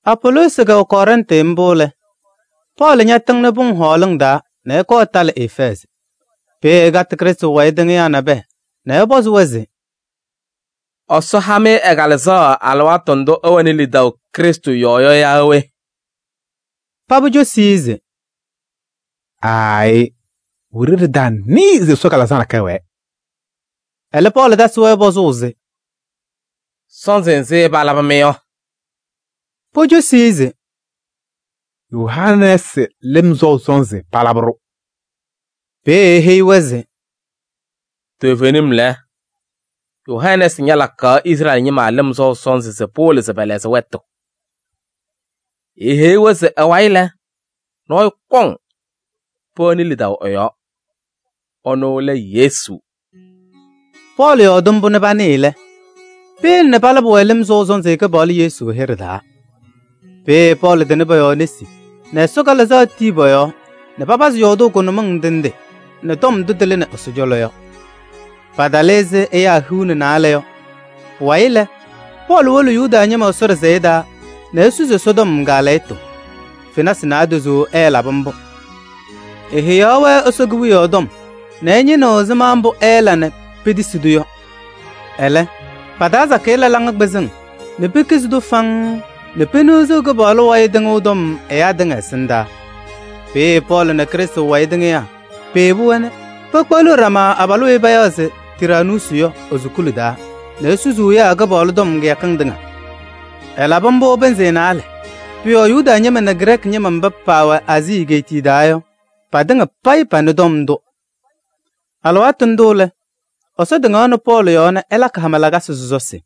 Apoloosi wɛ Kɔrɛntɩ mbʋ lɛ, Pɔɔlɩ ñatɩŋnɩ pʋŋ hɔɔlɩŋ taa nɛ ɛkɔɔ ɛtalɩ Efɛɛzɩ. Peeye ɛkatɩ Krɩstʋ wayɩ tɩŋɩyaa nabɛyɛ nɛ ɛpɔzɩ-wɛ se: “Ɛsɔ ha-mɩ ɛ-Kalɩzaɣ alɩwaatʋ ndʋ ɩwɛnɩ lidaʋ Krɩstʋ yɔɔ yɔ yaa we?” Paba cosi-i se: “Aayɩ! Wiɖiyi ɖɩtanɩɩ se Ɛsɔ Kalɩzaɣ nakɛyɛ wɛɛ.” Ɛlɛ Pɔɔlɩ tasɩ-wɛ pɔzʋʋ se: “Sɔnzɩ nzɩ palabɩ-mɩ yɔ?” Pocosi-i se: “Yohanɛɛsɩ lɩm sɔʋ sɔnzɩ palabɩ-ɖʋ.” Peeye eheyi-wɛ se: “Toovenim lɛ, Yohanɛɛsɩ ñalakaɣ Izrɛɛlɩ ñɩma lɩm sɔʋ sɔnzɩ se pɩwɩlɩ se pɛlɛɣzɩ wɛtʋ. Eeheyi-wɛ se ɛ-wayɩ lɛ, nɔɔyʋ kɔŋ, pɛwɛnɩ lidaʋ ɛ-yɔɔ. Ɛnʋ lɛ Yesu.” Pɔɔlɩ yɔɔdɩ mbʋ nɛ panɩɩ lɛ, peyele nɛ palabɩ-wɛ lɩm sɔʋ sɔnzɩ Kɩpaɣlʋ Yesu hɩɖɛ taa. Peeye Pɔɔlɩ tɩnɩ pɔ-yɔɔ nesi nɛ Ɛsɔ Kalɩzaɣ tii pɔ-yɔɔ nɛ papazɩ yɔɔdʋʋ kʋnʋmɩŋ ndɩ ndɩ nɛ tɔm ndʋ tɩlɩnɩ Ɛsɔ cɔlɔ yɔ. Paatalɩ ɛzɩ ɛyaa hiu nɛ naalɛ yɔ. Pʋwayɩ lɛ, Pɔɔlɩ wolo Yuda ñɩma Ɛsɔ ɖɩsɛyɛ taa nɛ esusi Ɛsɔtɔm kaalɛyɩtʋ. Fenasɩ naadozo ɛɛlabɩ mbʋ. Eheyaɣ-wɛ Ɛsɔ Kewiyaɣ tɔm nɛ ɛñɩnɩɣ ɛzɩma mbʋ ɛɛla nɛ petisi-tʋ yɔ. Ɛlɛ, pa-taa sakɩyɛ la laŋa kpɩzɩŋ nɛ pekizi-tʋ faŋŋ nɛ peniɣziɣ Kɩpaɣlʋ wayɩ tɩŋʋʋ tɔm ɛyaa tɩŋa ɛsɩndaa. Peeye Pɔɔlɩ nɛ Krɩstʋ wayɩ tɩŋɩyaa peyebi-wɛ nɛ pekpeɣliɣ ɖama abalʋ weyi payaɣ se Tiraanuusi yɔ e-sukuli taa nɛ esusuu ɛyaa Kɩpaɣlʋ tɔm kɩyakɩŋ tɩŋa. Ɛlabɩ mbʋ pɩnzɩ naalɛ. Pʋ-yɔɔ Yuda ñɩma nɛ Grɛɛkɩ ñɩma mba paawɛ Aazii egeetiye taa yɔ, patɩŋa payɩ panɩ tɔm ndʋ. Alɩwaatʋ ndʋ lɛ, Ɛsɔ tɩŋaɣnɩ Pɔɔlɩ yɔɔ nɛ ɛlakɩ hama lakasɩ sɔsɔsɩ.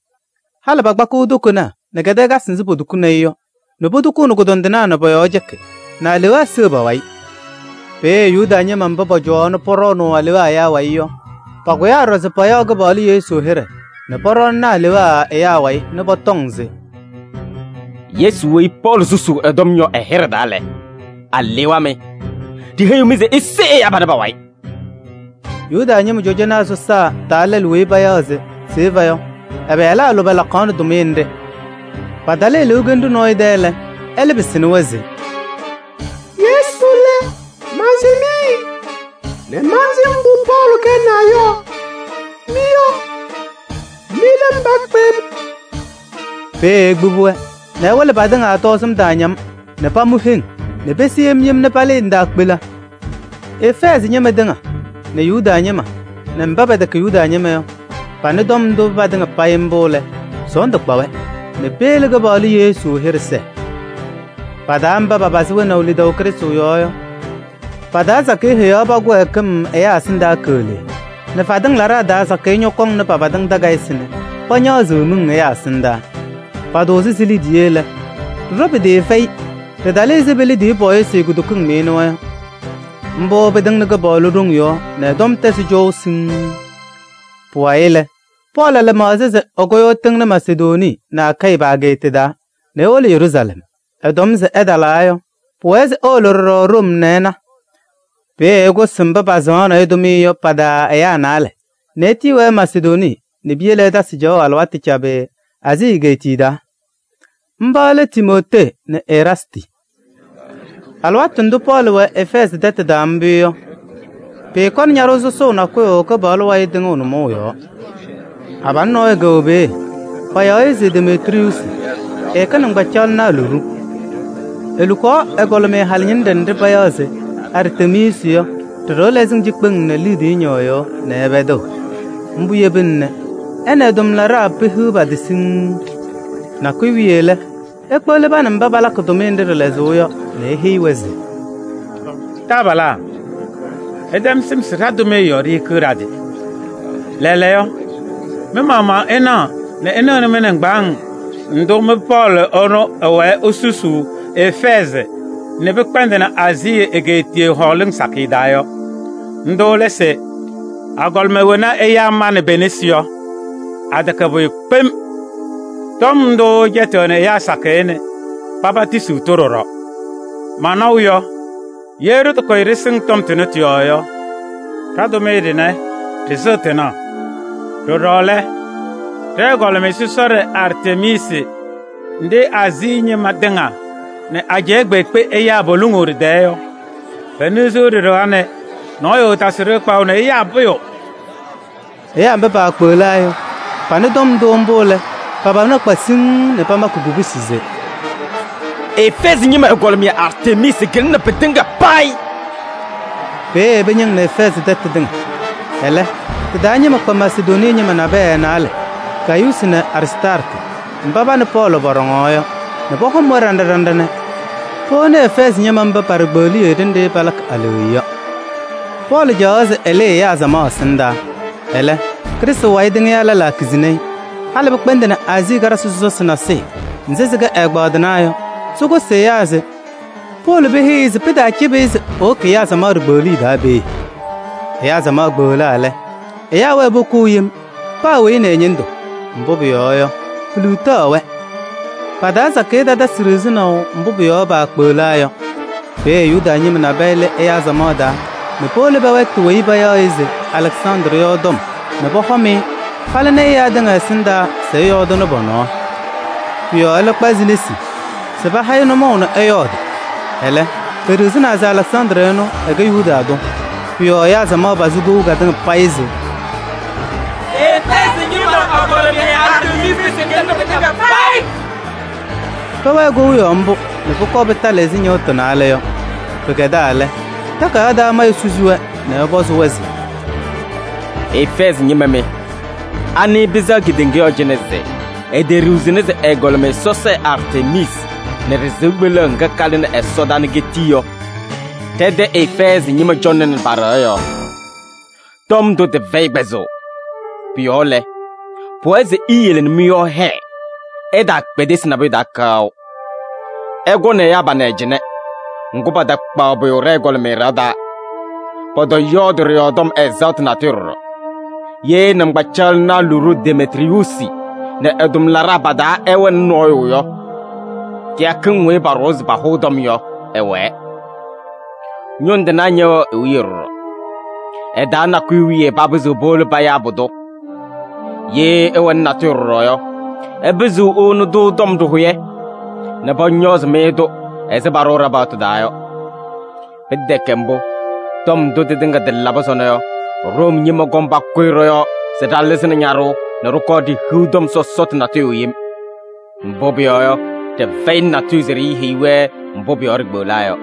Halɩ pakpakɩɣ tokonaa nɛ kɛdɛɛkasɩ mba potukuni-i yɔ nɛ potukuuni kʋdɔndɩnaa nɛ pɔ-yɔɔ cɛkɩ nɛ alewaa seɣ pa-wayɩ. Peeye Yuda ñɩma mba pɔcɔwaɣ nɛ pɔɖɔɔnʋʋ alewaa ɛyaa wayɩ yɔ, pakʋyaa ɖɔɖɔ se payaɣ Kɩpaɣlʋ Yesu hɩɖɛ nɛ pɔɖɔɔnɩnɩ alewaa ɛyaa wayɩ nɛ pɔtɔŋ se: “Yesu weyi Pɔɔlɩ susuu ɛ-tɔm yɔ ɛ-hɩɖɛ taa lɛ, alewaa mɩ! Ɖiheyiɣ-mɩ se ise ɛyaa panɛ pa-wayɩ!” Yuda ñɩma cɔjɔnaa sɔsaa taa lɛlʋ weyi payaɣ se Seva yɔ, ɛ-pɩyalaa lʋbɛ lakaɣnɩ tʋmɩyɛ nɖɩ. Patalɩ eluukenu nɔɔyʋ tɛ lɛ, ɛlɛ pɩsɩnɩ-wɛ se: “Yesu lɛ, mansɩm-ɩ nɛ mantɩlɩ mbʋ Pɔɔlɩ kɛnaa yɔ. Mɩ yɔ, mɩ lɛ mba kpem?” Peeye ekpibi-wɛ nɛ ɛwɩlɩ patɩŋa tɔɔzɩm taaña-m nɛ pamʋ heŋ nɛ pese yem yem nɛ palɩɩ ndaakpela. Efɛɛzɩ ñɩma tɩŋa nɛ Yuda ñɩma nɛ mba pɛtɛkɛ Yuda ñɩma yɔ panɩ tɔm ndʋ patɩŋa payɩ mbʋ lɛ, sɔɔndʋ kpa-wɛ nɛ peyele Kɩpaɣlʋ Yesu hɩɖɛ sɛɛ. Pa-taa mba paapazɩ wɛnaʋ lidaʋ Krɩstʋ yɔɔ yɔ, pa-taa sakɩyɛ heyaɣ pa-kɩwɛɛkɩm ɛyaa ɛsɩndaa keɣlee nɛ fadɩŋ laɖaa taa sakɩyɛ ñɔkɔnɩ pa-fatɩŋ takayɩsɩ nɛ pañaɣzɩ-sɩ miŋ ɛyaa ɛsɩndaa. Patʋʋzɩ si-liidiye lɛ, ɖɩɖɔwa pɩtɩɩfɛyɩ: ɖɩɩtalɩ ɛzɩ pe-liidiye pɔɔyɩsɩ kutokiŋ nɩɩnʋwa yɔ. Mbʋ pɩtɩŋnɩ Kɩpaɣlʋ ɖoŋ yɔɔ nɛ ɛ-tɔm tɛzɩ cɔʋ siŋŋ. Pʋwayɩ lɛ, Pɔɔlɩ la lɩmaɣza se ɛkʋyʋʋ ɛtɩŋnɩ Masedonii nɛ Akayɩ pa-ageeta taa nɛ ewolo Yeruusalɛm. Ɛtɔm se ɛtalaa yɔ, pʋwɛɛ se ewolo ɖɔɖɔ Room nɛ ɛna. Peeye ɛkʋsɩ mba pasɩŋaɣnɩ-ɩ tʋmɩyɛ yɔ pa-taa ɛyaa naalɛ nɛ etiyi-wɛ Masedonii nɛ piyele ɛtasɩ caɣʋ alɩwaatʋ cabɩ Aazii egeetiye taa. Mba lɛ Timootee nɛ Eraastɩ. Alɩwaatʋ ndʋ Pɔɔlɩ wɛ Efɛɛzɩ tɛtʋ taa mbʋ yɔ, pɩɩkɔnɩ ñaɖʋʋ sɔsɔʋ nakʋyʋ Kɩpaɣlʋ wayɩ tɩŋʋʋ nʋmɔʋ yɔɔ. Abalʋ nɔɔyʋ kɛwɛ peeye, payaɣ-ɩ se Demetriyuusi, ɛkɛ nɩŋgbacaɣlɩnaa luɖu. Elukaɣ ɛgɔlɩmɩyɛ halɩñɩnɖɛ nɖɩ payaɣ se Artemiisi yɔ ɖɩ-ɖɩɣa lɛzɩŋ cikpeŋ nɛ liidiye ñɩɣyʋʋ nɛ ɛpɛdɩɣ. Mbʋ yebina nɛ ɛ nɛ ɛ-tʋmlaɖaa pehiɣ pa-tɩ siŋŋ. Nakʋyʋ wiye lɛ, ekpeɣli pa nɛ mba palakɩ tʋmɩyɛ nɖɩ ɖɩ-lɛzʋʋ yɔ nɛ eheyi-wɛ se: “Taabalaa! Ɩtɛm sɩm se ɖa-tʋmɩyɛ yɔɔ ɖihikiɣ ɖa-tɩ. Lɛɛlɛɛyɔ, mɩ-maɣmaɣ ɩnaɣ nɛ ɩnɩɣ nɛ mɩ-nɩŋgbaaŋ ndʋ mɩ-Pɔɔlɩ ɛnʋ ɛwɛɛ esusuu Efɛɛzɩ nɛ pɩkpɛndɩnɩ Aazii egeetiye hɔɔlɩŋ sakɩyɛ taa yɔ. Ndʋ lɛ se agɔlɩma wena ɛyaa manɩ pe-nesi yɔ, atɛkɛ pʋyʋ kpem. Tɔm ndʋ ɛcɛtɩɣnɩ ɛyaa sakɩyɛ nɛ paba tisiɣ-tʋ ɖɔɖɔ. Manaʋ yɔ, ye ɖɩtakʋyɩ ɖɩsɩŋ tɔm ndʋ tɩ-yɔɔ yɔ, ɖa-tʋmɩyɛ ɖɩnɛ ɖɩsɩɣ tɩnaɣ! Ɖɔɖɔ lɛ, ɖɛ-ɛgɔlɩmɩyɛ sɔsɔɖɛ Artemiisi nɖɩ Aazii ñɩma tɩŋa nɛ ajɛɛ kpeekpe ɛyaa poluŋuu ɖɩ-tɛɛ yɔ, peniɣziɣ ɖɩ-ɖɩɣa nɛ nɔɔyʋ ɛɛtasɩɣ-ɖɩ kpaɣʋ nɛ ɛyaa pʋyʋ!” Ɛyaa mba paakpeɣlaa yɔ, panɩ tɔm ndʋ mbʋ lɛ, pa-pana kpa siŋŋ nɛ pamakɩ kubusi se: “Efɛɛzɩ ñɩma ɛgɔlɩmɩyɛ Artemiisi kɩlɩnɩ pɩtɩŋa payɩ!” Peeye pɩñɩŋnɩ Efɛɛzɩ tɛtʋ tɩŋa. Ɛlɛ tɩ-taa ñɩma kpa Masedonii ñɩma naalɛ nabɛyɛ: Gayuusi nɛ Aristaarkɩ mba pa nɛ Pɔɔlɩ pɔɖɔŋaɣ yɔ, nɛ pɔhɔm-wɛ ɖinɖa ɖinɖa nɛ powoni Efɛɛzɩ ñɩma mba pa-ɖikpeɣliye ɖenɖe palakɩ aleɣya yɔ. Pɔɔlɩ caɣaɣ se ɛlɩɩ ɛyaa samaɣ ɛsɩndaa. Ɛlɛ, Krɩstʋ wayɩ tɩŋɩyaa lɛlaa kizini-i. Halɩ pɩkpɛndɩnɩ Aazii karɩsɩ sɔsɔsɩ nasɩyɩ nzɩ sɩkɛ ɛ-ɛgbaadɩnaa yɔ nɛ sɩkʋsɩ ɛyaa se powolo peheyi-i se pɩtaacɩbɩ-ɩ se ewoki ɛyaa samaɣ ɖikpeɣliye taa peeye. Ɛyaa samaɣ kpeɣlaa lɛ, ɛyaa wɛɛ pokou yem: paa weyi nɛ ɛ-ñɩndʋ. Mbʋ pʋyɔɔ yɔ, piliɣtaɣ-wɛ. Pa-taa sakɩyɛ tatasɩ ɖiɣzinaʋ mbʋ pʋ-yɔɔ paakpeɣlaa yɔ. Peeye Yuda ñɩma nabɛyɛ lɩ ɛyaa samaɣ taa nɛ powolo pɛwɛɛtɩ weyi payaɣ se Alɛksandrɩ yɔ tɔm nɛ pɔhɔm-ɩ palɩzɩ ɛyaa tɩŋa ɛsɩndaa se ɛyɔɔdɩnɩ pɔ-nɔɔ. Pʋ-yɔɔ ɛlɛ kpazɩ nesi se paha-ɩ nʋmɔʋ nɛ ɛyɔɔdɩ. Ɛlɛ, peɖiɣzini se Alɛksandrɩ ɛnʋ, ɛkɛ Yuda tʋ. Pʋ-yɔɔ ɛyaa samaɣ pazɩ kou katɩŋa payɩ se: “Efɛɛzɩ ñɩma ɛgɔlɩmɩyɛ Artemiisi kɩlɩnɩ pɩtɩŋa payɩ!” Pɛwɛɛ kou yɔɔ mbʋ nɛ pʋkɔɔ pɩtalɩ ɛzɩ ñɩɣtʋ naalɛ yɔ. Pɩkɛdaa lɛ, takayaɣ taa mayʋ susi-wɛ nɛ ɛpɔzɩ-wɛ se: “Efɛɛzɩ ñɩma mɩ! Anɩ pɩsɛɣ kedeŋa yɔɔ cɩnɛ se eteɖiɣzini se ɛgɔlɩmɩyɛ sɔsɔɖɛ Artemiisi nɛ ɖɩ-sɩʋ kpeleɣ ŋga kalɩnɩ ɛsɔdaa nɛ ketii yɔ, ɖɛ-tɛ Efɛɛzɩ ñɩma cɔŋnɩnɩ pa-ɖɩɣa yɔɔ? Tɔm ndʋ tɩfɛyɩ kpɛzʋʋ. Pʋ-yɔɔ lɛ, pʋwɛɛ se iyele nɛ mɩ-yɔɔ hɛɛ, ɩtaakpedesi nabʋyʋ taa kaʋ. Ɩkɔnɩ ɛyaa panɛ cɩnɛ, ŋgʋ, patakpaɣ pʋyʋ ɖɛ-ɛgɔlɩmɩyɛ ɖɩɣa taa, pɔtɔyɔɔdɩ ɖɩ-yɔɔ tɔm ɛzaɣtʋ natʋyʋ ɖɔɖɔ. Ye nɩŋgbacaɣlɩnaa luɖu Demetriyuusi nɛ ɛ-tʋmlaɖaa pa-taa ɛwɛnɩ nɔɔyʋ yɔ, kɩyakɩŋ weyi paɖʋwa se pahʋʋ tɔm yɔ, ɩwɛɛ. Ñʋŋ tɩnaa ñɛwɛɣ i-wiye ɖɔɖɔ. Ɩ-taa nakʋyʋ wiye papɩzɩɣ powolo payaa pʋdʋ! Ye ɩwɛnɩ natʋyʋ ɖɔɖɔ yɔ, ɩpɩzɩɣ iwoni-tʋ tɔm ɖɩhʋyɛ nɛ pɔñɔɔzɩ-mɩ-tʋ ɛzɩ paɖʋʋ ɖa-paɣtʋ taa yɔ. Pɩtɛkɛ mbʋ, tɔm ndʋ tɩtɩŋa tɩlabɩ sɔnɔ yɔ, Room ñɩma kɔŋ pakʋyɩ ɖɔ-yɔɔ se ɖalɩzɩnɩ ñaɖʋʋ nɛ ɖɩkɔɔ ɖihiɣ tɔm sɔsɔtʋ natʋyʋ yem. Mbʋ pʋyɔɔ yɔ, ɖɩfɛyɩnɩ natʋyʋ se ɖiiheyi-wɛ mbʋ pʋ-yɔɔ ɖikpeɣlaa yɔ.”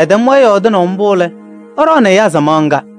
Ɛtɛm-wɛ yɔɔdɩnaʋ mbʋ lɛ, ɛɖɔɔnɩ ɛyaa samaɣ ŋga.